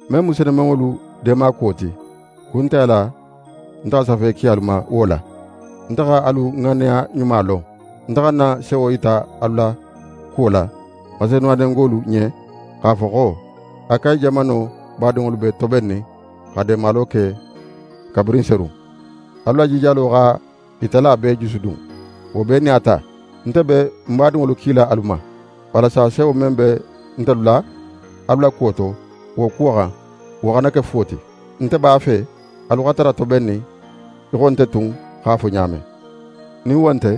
Men mu senumanŋolu deema kuwo ti, kun nte a la nte xa safe ki alu ma wo la. Nte xa alu ŋanneya ɲuma lon. Nte xa ń na sewo yita alu la kuwo la Maseduwanengolu ɲen, x'a fo xo: «Akayi jamano badinŋolu be tobennin xa deemalo ke kabirin serun.» Alu la jijalo xa i tala bee jusudun. Wo bee nin a ta, nte be n badinŋolu kila alu ma, walasa sewo men be nte la alu la kuwo to, wo kuwo xan, wo xana ke fuwo ti. Nte b'a fe alu xa tara tobennin í xo nte tun x'a fo ɲa men. Nin wo nte,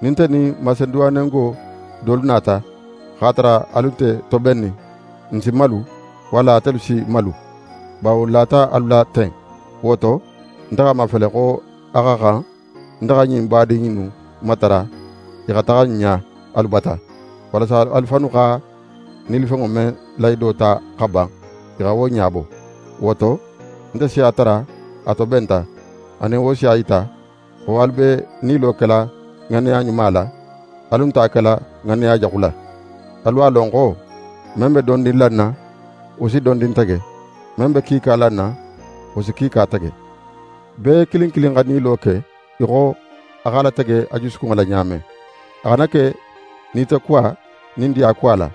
nin nte nin Maseduwanengo dolu nata, x'a tara alu nte tobennin, n si malu, walla atelu si malu, bawo n lata alu la ten. Wo to, nte x'a mafele xo a xa xan nte xa ɲin badin innu matara i xa taxa ń ɲa alu bata, walasa alu fannu xa nilifenŋo men lahido ta xa ban, i xa wo ɲabo. Wo to, nte si a tara a tobenta, anin wo si a yita xo alu be nilo kela ŋanneya ɲuma la, alu nte a kela ŋanneya jaxu la. Alu a lon xo: Men be dondin lanna, wo si dondin tege. Men be kiika lanna, wo si kiika tege. Bee kilin kilin xa nilo ke í xo a x'a latege a jusukunŋo la ɲa men. A xana ke nitokuwa nin diyakuwa la,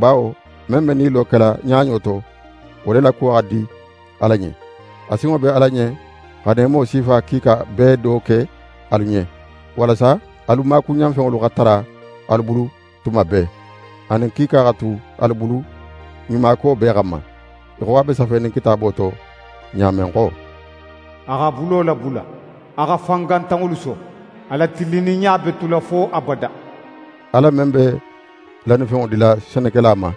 bawo men be nilo kela ɲaɲo to, wo le la kuwo xa di Ala ɲen. A sinŋo be Ala ɲen xa neemo sifa kiika bee do ke alu ɲen, walasa alu maakuɲanfenŋolu xa tara alu bulu tuma bee, anin kiika xa tu alu bulu kuɲumako bee xanma. Í xo a be safenin Kitaabo to ɲa men xo: «A x'a bulo labula, a xa fangantanŋolu so, a la tilinninɲa be tula fo abada.» Ala men be lannifenŋo dila senekela ma,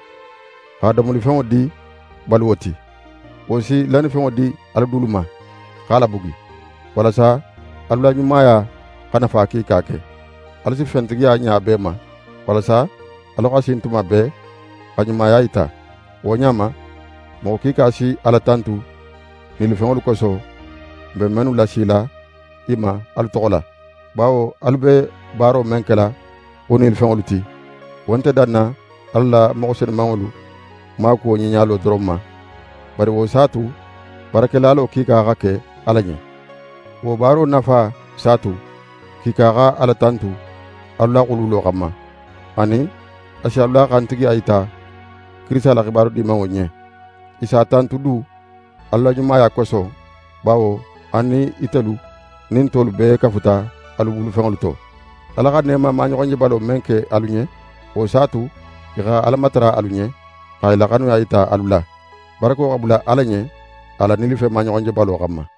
xa domolifenŋo di baluwo ti, wo si lannifenŋo di alu dulu ma, x'a labugi, walasa alu la ɲumaya xa nafa kiika ke. Alu si fentigiya ɲa bee ma, walasa alu xa sin tuma bee xa ɲumaya yita. Wo ɲa ma, moxo kiika si Ala tantu nilifenŋolu koso, n be mennu lasila i ma alu toxo la. Bawo alu be baaro men kela wo nilifenŋolu ti, wo nte danna Ala la moxo senumanŋolu maakuwo ɲiɲalo doron ma, bari wo s'a tu barakelalo kiika xa ke Ala ɲen. Wo baaro nafa s'a tu kiika xa Ala tantu alu la xululo xanma. Anin, a si alu la xantigiya yita Kirisita la xibaru Dimanŋo ɲen. I s'a tantu du alu la ɲumaya koso, bawo alu nin itelu nin tolu bee kafuta alu bulufenŋolu to. Ala xa neema maɲoxonjebalo men ke alu ɲen, wo s'a tu, i xa Ala matara alu ɲen, xa i la xanuya yita alu la. Barako xa bula Ala ɲen a la nilifen maɲoxonjebalo xanma.